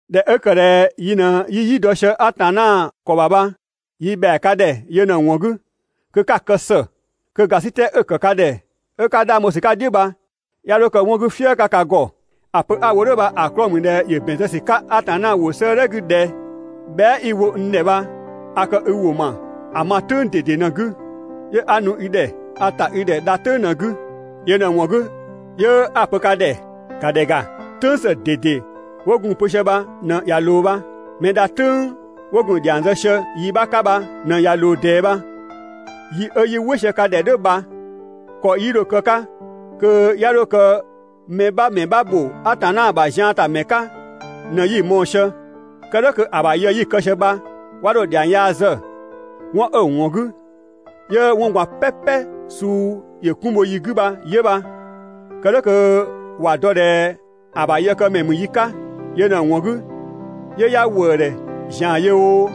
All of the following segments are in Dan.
꞊Dhɛ 'ö ‑kë ꞊dhɛ yi ꞊në 'yi "yi dɔ sië Atanna ‑kɔ ‑bha bha, yi ‑bhɛa ka ‑dhɛ yö ꞊në‑ ‑wɔn 'gü kö 'ka‑ kë ‑së kö ‑gasitɛ 'ö‑ ‑ya ‑kë ka ‑dhɛ 'ö 'ka 'dhang bho ‑sü 'ka‑ "dhiʋ̈ bha 'ya 'dho kë 'wɔn 'gü "fië 'ka ka ‑gɔ. ‑A pö 'a‑ wo "dhʋ̈ bha‑ 'klɔɔ‑ ‑mü ꞊dhɛ ‑yö ‑bɛn zë ‑sü 'ka Atanna ‑wʋ 'sëëdhɛ 'gü ꞊dhɛ: «Bhɛa" 'i‑ wo n ‑dhɛ bha a kë i ‑wʋ ‑ma ‑a ma "tʋ̈ng ꞊dede ꞊në‑ 'gü, 'yö 'a nu i ‑dhɛ. A ‑ta i ‑dhɛ dha "tʋ̈ng ꞊në‑ 'gü.» ‑A yö ꞊në‑ ‑wɔn 'gü 'yö 'a‑ pö ka ‑dhɛ: ‑Ka ‑dhɛ ‑ga, "tʋ̈ng ‑së ꞊dede 'wo gun‑ pö sië bha ꞊në ꞊ya ꞊loo bha. Mɛ dha "tʋ̈ng 'wo gun‑ ‑dhiang zë sië yi 'bha 'ka bha ꞊në ꞊ya ꞊loo ꞊dɛɛ bha. Yi 'ö 'yi "wɩ sië ka ‑dhɛ "dhʋ̈ bha ‑kɔ 'yi dho‑ kë‑ 'ka kö 'ya 'dho kë mɛ 'bha ‑mɛ 'bha ‑bho Atanna ‑bha zian ‑ta ‑mɛ 'ka ꞊në 'yi‑ mɔɔ‑ sië. Kë "dhʋ̈ kö‑ ‑bha yë 'yi‑ kë sië bha 'wa 'dho‑ ‑dhiang yaa zë. 'Wɔn 'ö‑ ‑wɔn 'gü 'yö 'wɔn ꞊gban "pɛpɛ suu ‑yö 'kun bho yi 'gü bha 'yö bha, kë "dhʋ̈ kö ‑wa dɔ ꞊dhɛ ‑a ‑bha yëkëmɛ ‑mü yi 'ka. Yö ꞊në‑ ‑wɔn 'gü 'yö 'ya ‑wëëdhɛ ‑zian yö oo,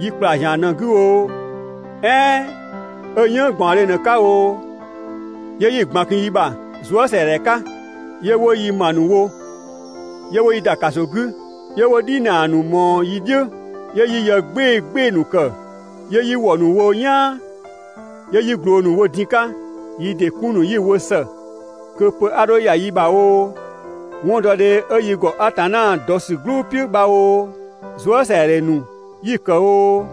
'yi ‑kpla ‑zian ꞊në‑ 'gü oo, "ɛɛn 'ö "yënng ꞊gbaɔndhe ꞊në‑ 'ka oo, 'yö 'yi‑ ꞊gban kun yi ‑bha zuësɛadhɛ 'ka. 'Yö 'wo yi ‑ma ‑nu wo, 'yö 'wo yi ‑da ‑kaso 'gü, 'yö 'wo "dhinaa ‑nu ꞊mɔɔ yi "dhiʋ̈, 'yö 'yi yë "gbɩɩ‑ "gbɩɩ‑ ‑nu ‑kë, 'yö 'yi ‑wɔ ‑nu wo "yaan, 'yö 'yi ꞊gloo ‑nu wo diin‑ 'ka. Yi ‑dɩ 'kun ‑nu 'yi‑ wo ‑së kö pö 'a 'dho ‑ya yi bha oo, 'wɔndɔdhe 'ö yi ‑gɔ Atanna dɔ ‑sü "gblʋ "piʋ̈ ‑bha oo, zuësɛadhɛ ‑nu 'yi‑ ‑kë oo,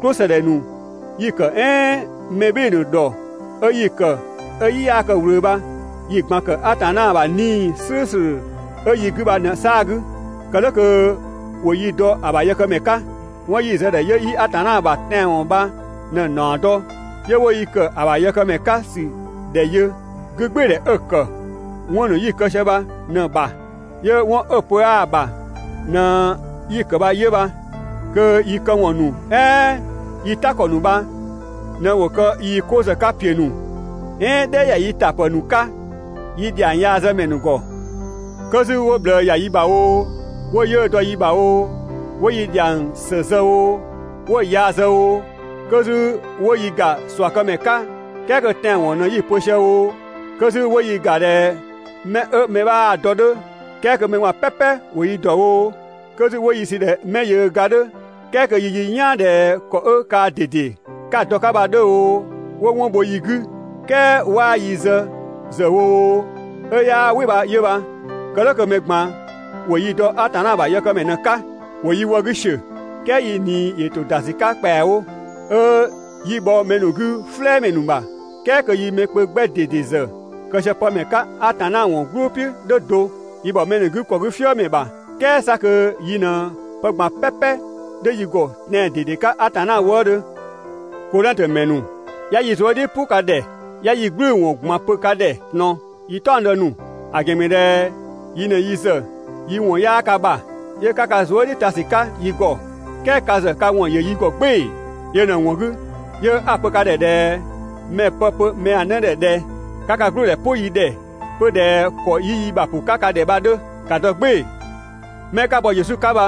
"klʋsëdhɛ ‑nu 'yi‑ ‑kë "ɛɛn mɛ ‑nu ‑dhɔ 'ö yi ‑kë 'ö‑ "yi 'yaa kë‑ ꞊wlö bha yi‑ ꞊gban ‑kë "dhʋ̈ Atanna ‑bha 'Nii‑ "slʋ̈ʋ̈slʋ̈ 'ö yi 'gü bha ꞊në‑ 'saa‑ 'gü, (kë "dhʋ̈ kö ‑wo yi dɔ‑ ‑bha yëkëmɛ 'ka). 'Wɔn 'yi zë‑ ‑dhɛ 'yö 'yi Atanna ‑bha tɛanwɔn bha ꞊në‑ ‑naɔ dɔ, 'yö ('wo yi ‑kë ‑a ‑bha yëkëmɛ 'ka ‑sü ‑dhɛ yö) 'gügbɩɩdhɛ 'ö‑ ‑kë 'wɔn ‑nu 'yi‑ kë sië bha ꞊në‑ ‑bha, 'yö 'wɔn 'ö pö 'aa‑ ‑bha ꞊në 'yi‑ ‑kë bha 'yö bha. Kö yi këwɔn ‑nu "ɛɛn yi "ta ‑kɔ ‑nu bha ꞊në ‑wo kë yii‑ 'ko ‑zë 'ka ‑piö ‑nu "ɛɛn "dhɛ ‑ya yi ‑ta ‑pë ‑nu 'ka yi ‑dhiang yaa zë ‑mɛ ‑nu ‑gɔ. 'Kö 'zü 'wo ꞊bhlë ‑ya yi ‑bha oo, 'wo 'yiʋ̈‑ dɔ yi ‑bha oo, 'wo yi ‑dhiang ‑së zë oo, 'wo‑ yaa zë oo, 'kö 'zü 'wo yi ‑ga ꞊suakëmɛ 'ka "kɛɛ kö tɛanwɔn ꞊në 'yi‑ pö sië oo, kö 'zü 'wo yi ‑ga ꞊dhɛ 'mɛ 'ö mɛ 'bhaa‑ dɔ‑ 'dhö "kɛɛ kö mɛ ꞊gban "pɛpɛ 'wo yi ‑dɔ oo, 'kö 'zü 'wo yi sü ꞊dhɛ 'mɛ yöö ga‑ 'dhö "kɛɛ kö yi "yaan ꞊dhɛ ‑kɔ 'ö kaa ꞊dede 'ka‑ dɔ‑ 'ka bha‑ 'dhö oo, 'wo 'wɔn bho yi 'gü "kɛɛ 'waa yi zë ‑zë wo oo, 'ö 'yaa "wɩ bha 'yö bha, kë "dhʋ̈ kö mɛ ꞊gban ‑wo yi dɔ Atanna ‑bha yëkëmɛ ꞊në‑ 'ka. ‑Wo yi wë 'gü ‑siö, "kɛɛ yi ꞊nii ‑yö ‑to ‑da ‑sü 'ka ‑kpɛawo, 'ö 'yi bhɔ mɛ ‑nu 'gü "flɛɛmɛ ‑nu ‑bha, "kɛɛ kö yi mɛ kpö 'gbɛ ꞊dede ‑zë kë sië pë ‑mɛ 'ka Atanna ‑wɔn "gblʋ "piʋ̈ "dhʋ̈ do. Yi ‑bhɔ mɛ ‑nu 'gü ‑kɔ 'gü "fiëmɛ ‑bha, "kɛɛ 'sa kö yi ꞊në pë ꞊gban "pɛpɛ 'dhö yi ‑gɔ tɛan‑ ꞊dede 'ka Atanna wëëdhö. Kodhɛngtö ‑mɛ ‑nu, 'ya yi zuë" "dhiʋ̈ "pʋ ka ‑dhɛ, 'ya yi "gblʋ̈ʋ̈‑ ‑wɔn ꞊gban pö ka ‑dhɛ ꞊tɔn yi "taɔngdë ‑nu. ‑A ‑gɛn ‑mü ꞊dhɛ yi ꞊në yi ‑zë yi ‑wɔn 'yaa ka ‑bha, 'yö 'ka ka zuë" "dhiʋ̈ ta ‑sü 'ka yi ‑ gɔ, "kɛɛ ka ‑zë ka ‑wɔn ‑yö yi ‑gɔ "gbɩɩ‑. Yö ꞊në‑ ‑wɔn 'gü 'yö 'a‑ pö ka ‑dhɛ ꞊dhɛ mɛ‑ pë pö mɛa‑ 'në ‑dhɛ ꞊dhɛ: «'Ka ka "gblüdhɛ "pʋ yi ‑dhɛ 'pö ꞊dhɛ ‑kɔ 'yi yi ‑bha ‑pʋ 'ka ka ‑dhɛ bha‑ 'dhö, ‑ka dɔ "gbɩɩ‑. 'Mɛ 'ka bɔ Yesu 'ka bha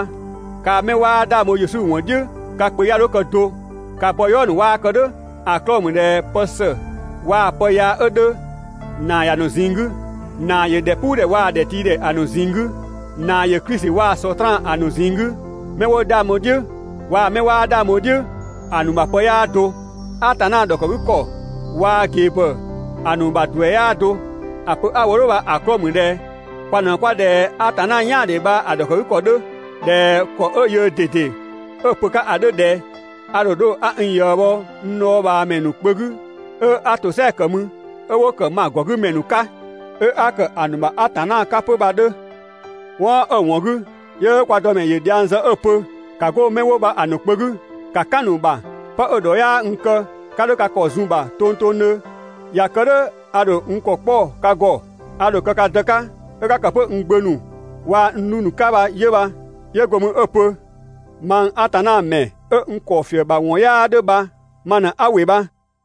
kaa‑ 'mɛ 'waa 'dhang bho Yesu ‑wɔn "dhiʋ̈ bha ka kpö 'ya 'dho kë do. Ka bɔ "yɔɔ ‑nu 'waa kë "dhʋ̈. ‑A 'klɔɔ‑ ‑mü ꞊dhɛ pë ‑së waa‑ pë yaa 'ö 'dhö, ‑naa ‑ya ‑nu ꞊zinng 'gü. ‑Naa ‑yö ‑dhɛpuudhɛ waa‑ ‑dhɛtiidhɛ ‑a ‑nu ꞊zinng 'gü. ‑Naa ‑yö Klisi waa‑ Sɔtraan ‑a ‑nu ꞊zinng 'gü. 'Mɛ 'wo 'dhang bho‑ "dhiʋ̈ waa‑ 'mɛ 'waa 'dhang bho‑ "dhiʋ̈ ‑a ‑nu ‑bha pë 'yaa do. Atanna ‑dhɔkëgükɔ waa‑ ꞊gebhɔ ‑a ‑nu ‑duɛ 'yaa do. ‑A pö 'a‑ wo "dhʋ̈ bha‑ 'klɔɔ‑ ‑mü ꞊dhɛ kwa ꞊në 'kwa ꞊dhɛ Atanna "yaandhe bha‑ ‑dhɔkëgükɔ 'dhö ꞊dhɛ ‑kɔ 'ö yöö ꞊dede 'ö‑ pö‑ 'ka ‑a 'dhö ꞊dhɛ: «A ‑dho 'dho 'a n ꞊yië bho n dhɔɔbhaamɛ ‑nu kpö 'gü, 'ö 'a ‑tosɛa ‑kë mü, 'ö 'wo ‑kë n ‑ma ‑gɔ 'gü ‑mɛ ‑nu 'ka, 'ö 'a ‑kë ‑a ‑nu ‑bha Atanna 'ka 'pö.» 'Wɔn 'ö‑ ‑wɔn 'gü 'yö kwa Dëmɛ ‑yö dhiang zë 'ö‑ pö: «‑Ka 'go 'mɛ 'wo bha‑ ‑nu kpö 'gü, ‑ka "kan‑ ‑nu ‑bha, 'pë 'ö‑ ‑dhɔ 'yaa n kë, 'ka 'dho ka ‑kɔ zun‑ ‑bha tongtongdhö, ꞊ya kë "dhʋ̈ a ‑dho n ‑kɔ 'kpɔ ka ‑gɔ, a ‑dho kë ka Dë 'ka, 'ö 'ka ‑kë 'pö n gbö ‑nu waa‑ n 'dhu ‑nu 'ka bha 'yö bha.» 'Yö go mü 'ö‑ pö: «Mang Atanna ‑mɛ 'ö n ‑kɔ ‑fië ‑bha ‑wɔn 'yaa 'dhö bha ma ꞊në 'a ‑wɩ bha.»